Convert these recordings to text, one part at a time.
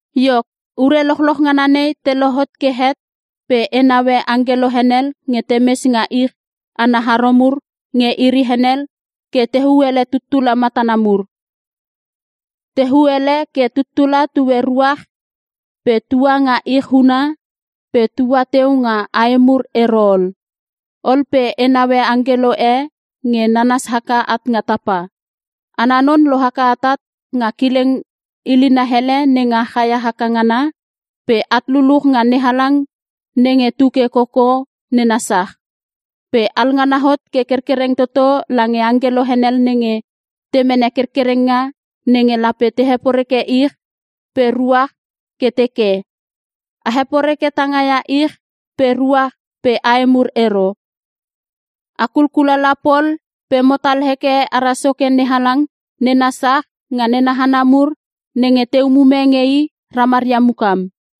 Iok, ure lochloch ngana nei te lohot ke het pe e naue angkelo henel nge temes nga ich ana haro mur nge iri henel ke tehuu ele tuttula matana mur. Tehuu ele ke tuttula tue ruach pe tua nga ich huna pe tua teu nga ae mur ero ol. Ol pe e naue angkelo e nge nanas haka at nga tapa. Ana non lohaka atat nga kileng hilina ele nenga chaia haka ngana pe at luluch nga NeHalang nenge tuke koko nena sach. Pe alngana hot ke kerkereng toto lange angkelo henel nenge te mene kerkerenga nenge lape te heporeke ich pe ruach ke teke, “A heporeke tangaia ich pe ruach pe ae mur ero. A kulkulala pol pe motal heke ara Soke NeHalang nena sach nga nena hana mur nenge te umume nge I ramaria mukam.”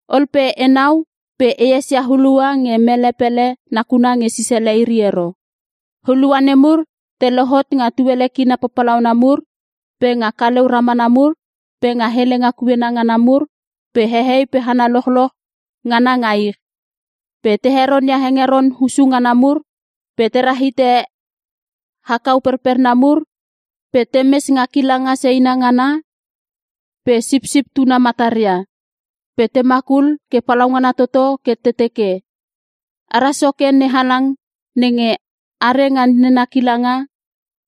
Ol pe enau pe e esia hulua nge mele pele nakuna nge sisele iri ero. Hulua nemur te lohot nga tuele kina papalauna mur pe nga kaleu ramana mur pe nga helenga kuena ngana mur pe hehei pe hana lochloch ngana nga ich. Pe te heronia hengeron hussu ngana mur pe te rahite akau perperna mur pe temes nga kilanga seina ngana pe Sipsip Tuna mataria. Pe te makul ke palaungana toto ke te teke, “Ara Soke NeHalang nenge are nga nena kilanga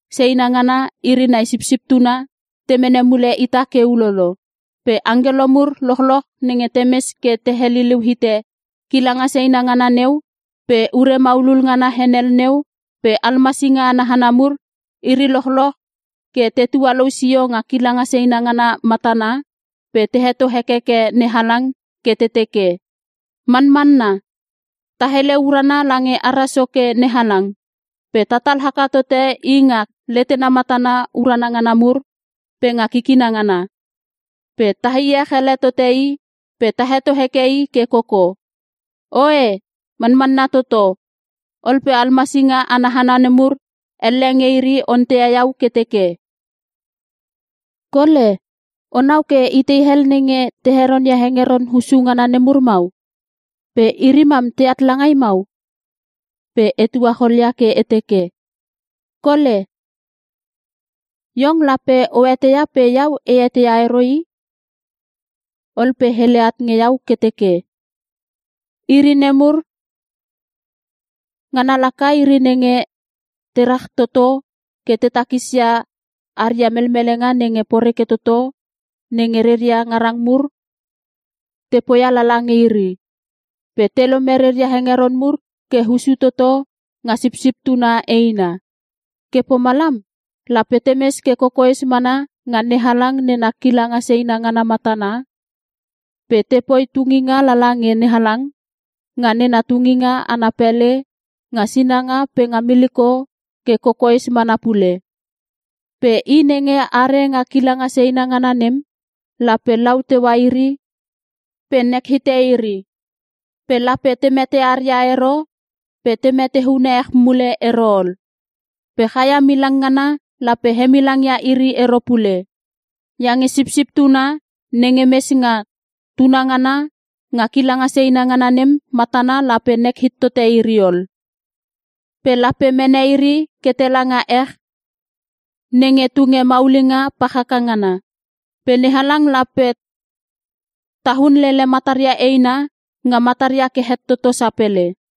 seina ngana iri nai Sipsip Tuna te mene mule ita ke ulolo.” Pe angkelo mur lochloch nenge temes ke te heliliu hite kilanga seina ngana neu pe ure maulul ngana henel neu pe almasinga ana hana nemur, iri lochloch ke te tualou sio nga kilanga seina ngana matana pe te heto hekeke NeHalang ke te teke, “Manmanna! Ta hele urana lange ara Soke NeHalang pe tatal haka tote I nga letena matana urana ngana mur pe nga kikina ngana. Pe ta iech ele tote I pe ta heto heke I ke koko. Oe, Manmanna Toto!” Ol pe almasinga ana hana nemur elle nge iri onteia iau ke teke, “Kole, onau ke itei hel nenge te heronia hengeron hussu ngana nemur mau? Pe iri mam teat langai mau?” Pe e tuacholia ke e teke, “Kole, iong lape o eteia pe iau e eteia ero i.” Ol pe hele at nge iau ke teke, “Iri nemur, ngana laka iri nenge te ratoto ke te takisia aria melmelenga nenge poreke toto, nenge reria ngarang mur te poia lala nge iri. Pe te lome reria hengeron mur ke hussu toto nga Sipsip Tuna eina. Ke pomalam, “Lape temes ke kokoes mana nga NeHalang nena kilanga seina ngana matana, pe tepoi tunginga lala nge NeHalang, nga nena tunginga ana pele nga sinanga pe nga miliko ke kokoes mana pule. Pe i nenge are nga kilanga seina ngana nem, lape lau teua iri pe nek hite iri. Pe lape te metearia ero pe te meteune ech mule ero ol. Pe chaia milang ngana lape hemilangia iri ero pule. Iange Sipsip Tuna nenge mes nga tunangana nga kilanga seina ngana nem matana lape nek hit tote iri ol. Pe lape mene iri ke tela nga ech nenge tunge maulinga pach haka ngana. Pe NeHalang lape taun lele mataria eina nga mataria ke het toto sapele.”